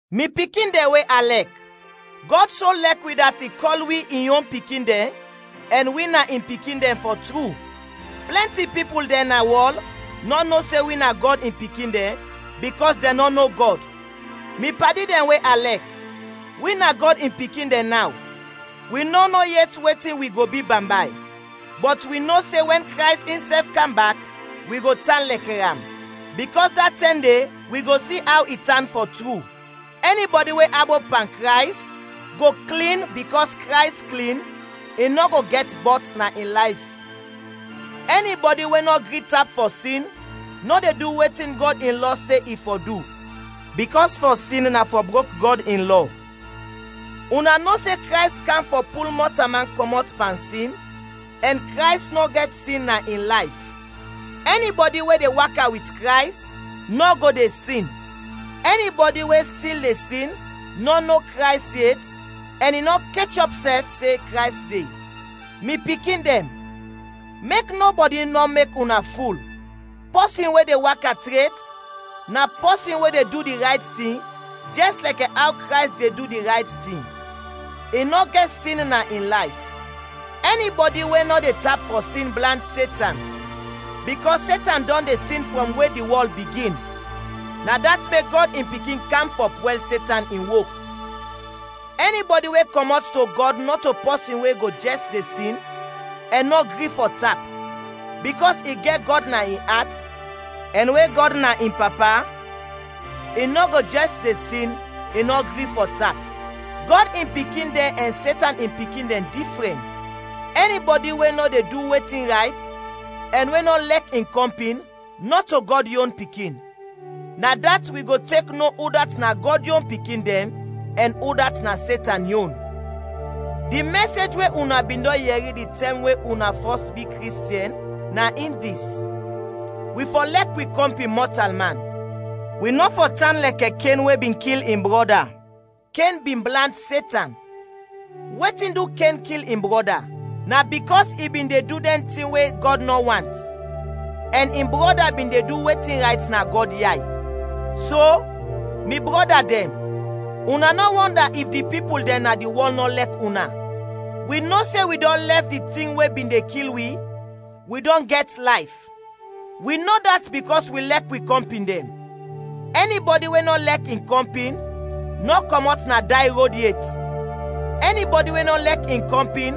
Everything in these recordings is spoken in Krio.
Mi pikin dɛn we a lɛk, Gɔd so lɛk wi dat i kɔl wi in yon pikin dɛn ɛn wi na in pikin dɛn, fɔ tru. Plɛnti pipul dɛn na wɔl nɔ no se wi na Gɔd in pikin dɛn, bikɔs dɛn nɔ no Gɔd. Mi padi dɛn we a lɛk, wi na Gɔd in pikin dɛn naw; wi nɔ no yet wetin wi go bi bambay, bɔt wi no se wɛn Krays insɛf kam bak wi go tan lɛkɛ am, bikɔs da tɛm de wi go si aw i tan fɔ tru. Ɛni bɔdi we abop pan Krays go klin bikɔs Krays klin, i nɔ go gɛt bɔt na in layf. Ɛni bɔdi we nɔ gri tap fɔ sin nɔ de du wetin Gɔd in lɔ se i fɔ du, bikɔs fɔ sin na fɔ brok Gɔd in lɔ. Una no se Krays kam fɔ pul mɔtalman kɔmɔt pan sin ɛn Krays nɔ gɛt sin na in layf. Ɛni bɔdi we de waka wit Krays, nɔ go de sin. Ɛni bɔdi we stil de sin nɔ no Krays yet ɛn i nɔ kechɔp sɛf se Krays de. Mi pikin dɛn, mek nɔbɔdi nɔ mek una ful. Pɔsin we de waka tret, na pɔsin we de du di rayt tin, jɛs lɛkɛ aw Krays de du di rayt tin, i nɔ gɛt sin na in layf. Ɛni bɔdi we nɔ de tap fɔ sin blant Setan, bikɔs Setan dɔn de sin frɔm we di wɔl bigin; na dat mek Gɔd in Pikin kam fɔ pwɛl Setan in wok. Ɛni bɔdi we kɔmɔt to Gɔd nɔto pɔsin we go jɛs de sin ɛn nɔ gri fɔ tap, bikɔs i gɛt Gɔd na in at, ɛn we Gɔd na in Papa, i nɔ go jɛs de sin, i nɔ gri fɔ tap. Gɔd in pikin dɛn ɛn Setan in pikin dɛn difrɛn: ɛni bɔdi we nɔ de du wetin rayt ɛn we nɔ lɛk in kɔmpin, nɔto Gɔd yon pikin. Na dat wi go tek no udat na Gɔd yon pikin dɛn ɛn udat na Setan yon. Di mɛsej we una bin dɔn yɛri di tɛm we una fɔs bi Kristiɛn na in dis: wi fɔ lɛk wi kɔmpin mɔtalman. Wi nɔ fɔ tan lɛkɛ Ken we bin kil in brɔda; Ken bin blant Setan. Wetin du Ken kil in brɔda? Na bikɔs i bin de du dɛn tin we Gɔd nɔ want, ɛn in brɔda bin de du wetin rayt na Gɔd yay. So, mi brɔda dɛn, una nɔ wɔnda if di pipul dɛn na di wɔl nɔ lɛk una. Wi no se wi dɔn lɛf di tin we bin de kil wi, wi dɔn gɛt layf; wi no dat bikɔs wi lɛk wi kɔmpin dɛn. Ɛni bɔdi we nɔ lɛk in kɔmpin, nɔ kɔmɔt na day rod yet. Ɛni bɔdi we nɔ lɛk in kɔmpin,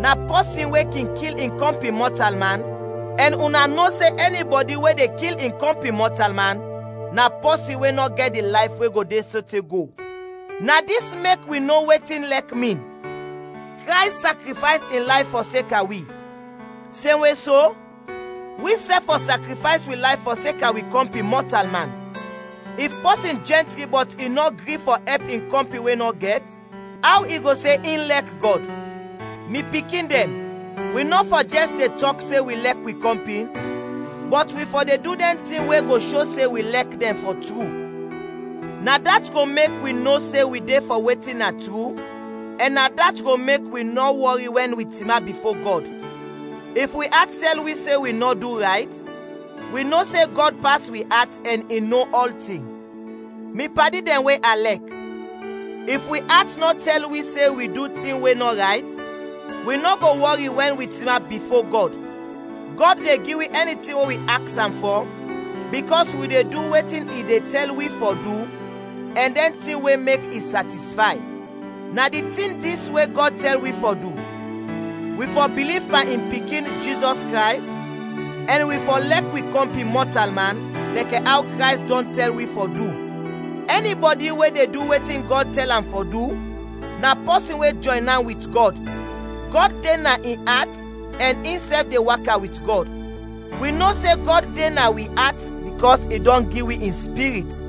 na pɔsin we kin kil in kɔmpin mɔtalman, ɛn una no se ɛni bɔdi we de kil in kɔmpin mɔtalman, na pɔsin we nɔ gɛt di layf we go de sote go. Na dis mek wi no wetin lɛk min: Krays sakrifays in layf fɔseka wi. Semwe so, wisɛf fɔ sakrifays wi layf fɔseka wi kɔmpin mɔtalman! If pɔsin jɛntri bɔt i nɔ gri fɔ ɛp in kɔmpin we nɔ gɛt, aw i go se in lɛk Gɔd? Mi pikin dɛn, wi nɔ fɔ jɛs de tɔk se wi lɛk wi kɔmpin, bɔt wi fɔ de du dɛn tin we go sho se wi lɛk dɛn fɔ tru. Na dat go mek wi no se wi de fɔ wetin na tru ɛn na dat go mek wi nɔ wɔri wɛn wi tinap bifo Gɔd. If wi at tɛl wi se wi nɔ du rayt, wi no se Gɔd pas wi at ɛn i no ɔltin. Mi padi dɛn we a lɛk, if wi at nɔ tɛl wi se wi du tin we nɔ rayt, wi nɔ go wɔri wɛn wi tinap bifo Gɔd. Gɔd de gi wi ɛni tin we wi aks am fɔ, bikɔs wi de du wetin i de tɛl wi fɔ du ɛn dɛn tin we mek i satisfay. Na di tin dis we Gɔd tɛl wi fɔ du: Wi fɔ biliv pan in Pikin, Jizɔs Krays, ɛn wi fɔ lɛk wi kɔmpin mɔtalman, lɛkɛ aw Krays dɔn tɛl wi fɔ du. Ɛni bɔdi we de du wetin Gɔd tɛl am fɔ du, na pɔsin we jɔyn an wit Gɔd; Gɔd de na in at ɛn insɛf de waka wit Gɔd. Wi no se Gɔd de na wi at bikɔs i dɔn gi wi in Spirit.